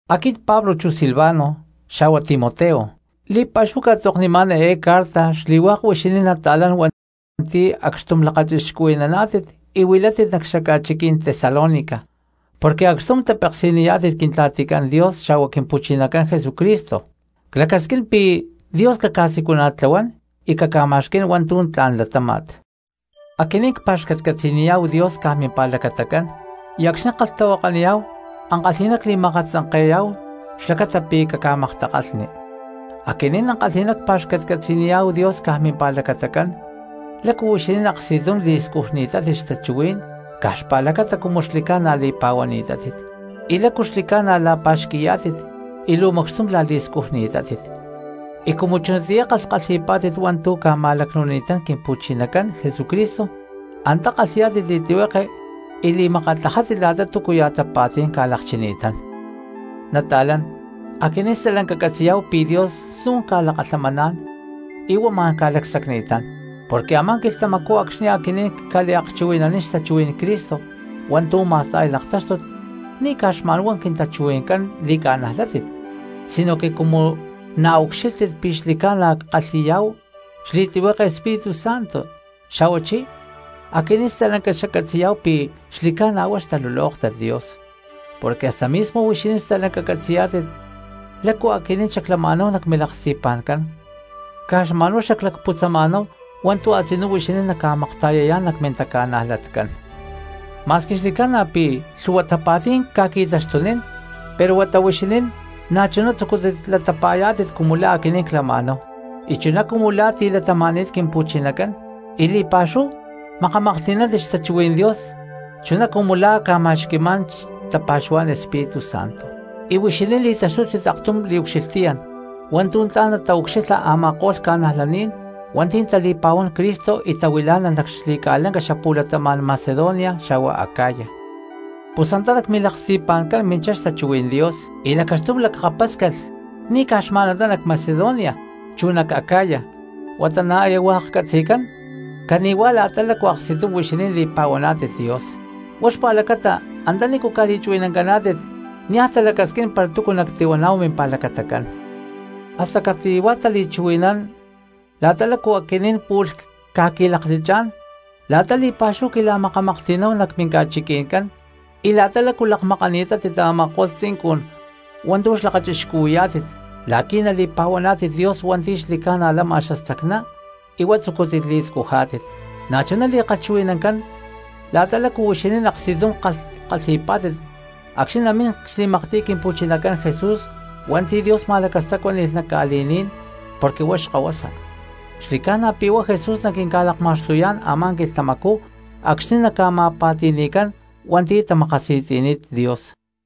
Aquit Pablo chu Silvano xa̠hua Timoteo, li̠pa̠xúhu cca̠tzoknimá̠n eé carta xli̠hua̠k huixinín nata̠lán hua̠nti̠ acxtum lakachixcuhui̠naná̠tit y huilátit nac xaca̠chiquí̠n Tesalónica, porque acxtum tapeksi̠niyá̠tit Quintla̠ticán Dios xa̠huá Quimpu̠chinacán Jesucristo. Clacasquín pi̠ Dios caca̠siculana̠tlahuán y caca̠ma̠xquí̠n hua̠ntu̠ tla̠n latáma̠t. Aquinín cpa̠xcatcatzi̠niyá̠hu Dios caj mimpa̠lacatacán y acxni̠ ckalhtahuakaniyá̠hu ankalhi̠ná cli̠ma̠katzanke̠yá̠hu xlacata pi̠ caca̠maktakalhni. Aquinín ankalhi̠ná cpa̠xcatcatzi̠niyá̠hu Dios caj mimpa̠lacatacán lácu huixinín aksti̠tum li̠scujni̠tátit xtachuhuí̠n caj xpa̠lacata cumu xli̠ca̠na li̠pa̠huaná̠tit, y lácu xli̠ca̠na la̠pa̠xqui̠yá̠tit y luu macxtum la̠li̠scujni̠tátit, y cumu chunatiyá kalhkalhi̠pá̠tit hua̠ntu̠ ca̠ma̠lacnu̠nini̠tán Quimpu̠chinacán Jesucristo antá kalhi̠yá̠tit li̠tlihueke y li̠makatlajá̠tit la̠ta túcuya̠ tapa̠tí̠n ca̠lakchini̠tán. Nata̠lán, aquinín stalanca ccatzi̠yá̠hu pi̠ Dios snu̠n ca̠lakalhamaná̠n y huá ma̠n ca̠lacsacni̠tán. Porque a̠má quilhtamacú acxni̠ aquinín cca̠liakchuhui̠naní̠n xtachuhuí̠n Cristo hua̠ntu̠ ma̠sta̠y laktáxtut ni̠ caj xma̠n huá quintachuhui̠ncán li̠ca̠najlátit sinoque cumu na̠ ucxílhtit pi̠ xli̠ca̠na ckalhi̠yá̠hu xli̠tlihueke Espíritu Santo xa̠huachí aquinín stalanca xaccatzi̠yá̠hu pi̠ xli̠ca̠na huá xtalulóktat Dios, porque hasta mismo huixinín stalanca catzi̠yá̠tit lácu aquinín xaclama̠náhu nac milaksti̠pa̠ncán, caj xma̠n huá xaclacputzama̠náhu hua̠ntu̠ a̠tzinú huixinín naca̠makta̠yayá̠n nac mintaca̠najlatcán. Ma̠squi xli̠ca̠na pi̠ lhu̠hua tapa̠tí̠n ca̠qui̠taxtunín pero huata huixinín na̠chuná tzucútit latapa̠yá̠tit cumu la̠ aquinín clama̠náhu y chuná cumu la̠ tilatama̠ni̠t Quimpu̠chinacán, y li̠pa̠xúhu makamaklhti̠nántit xtachuhuí̠n Dios chuná cumu la̠ ca̠ma̠xqui̠má̠n tapa̠xuhuá̠n Espíritu Santo. Y huixinín li̠taxtútit aktum liucxilhtiyán hua̠ntu̠ tla̠n nataucxilha a̠ma̠ko̠lh ca̠najlaní̠n hua̠nti̠ tali̠pa̠huán Cristo y tahuilá̠nalh nac xli̠ca̠lanca xapu̠latama̠n Macedonia xa̠hua Acaya. Pus antá nac milaksti̠pa̠ncán minchá xtachuhuí̠n Dios y lacaxtum lakapáscalh ni̠ caj xma̠n antá nac Macedonia chu nac Acaya huata na̠ aya hua̠k catzi̠cán cani̠huá la̠ta lácu aksti̠tum huixinín li̠pa̠huaná̠tit Dios; huá xpa̠lacata antanícu ca̠li̠chuhui̠nancaná̠tit niaj talacasquín para túcu nactihuaná̠hu mimpa̠lacatacán. Hasta cati̠huá tali̠chuhui̠nán la̠ta lácu aquinín pu̠lh cca̠qui̠laklachá̠n, la̠ta li̠pa̠xúhu quila̠makamaklhti̠náhu nac minca̠chiqui̠ncán y la̠ta lácu lakmakántit a̠ma̠ko̠lh tzincun hua̠ntu̠ xlakachixcuhui̠yá̠tit la̠qui̠ nali̠pa̠huaná̠tit Dios hua̠nti̠ xli̠ca̠na lama xastacná y huá tzucútit li̠scujá̠tit. Na̠chuná li̠kalhchuhui̠nancán la̠ta lácu huixinín aksti̠tum kalhkalhi̠pá̠tit acxni̠ namín xli̠maktiy Quimpu̠chinacán Jesús hua̠nti̠ Dios ma̠lacastacuani̠ni̠t nac ca̠li̠ní̠n porque huá xkahuasa; xli̠ca̠na pi̠ huá Jesús naquinca̠lakma̠xtuyá̠n a̠má quilhtamacú acxni̠ naca̠ma̠pa̠ti̠ni̠cán hua̠nti̠ tamakasi̠tzi̠ni̠t Dios.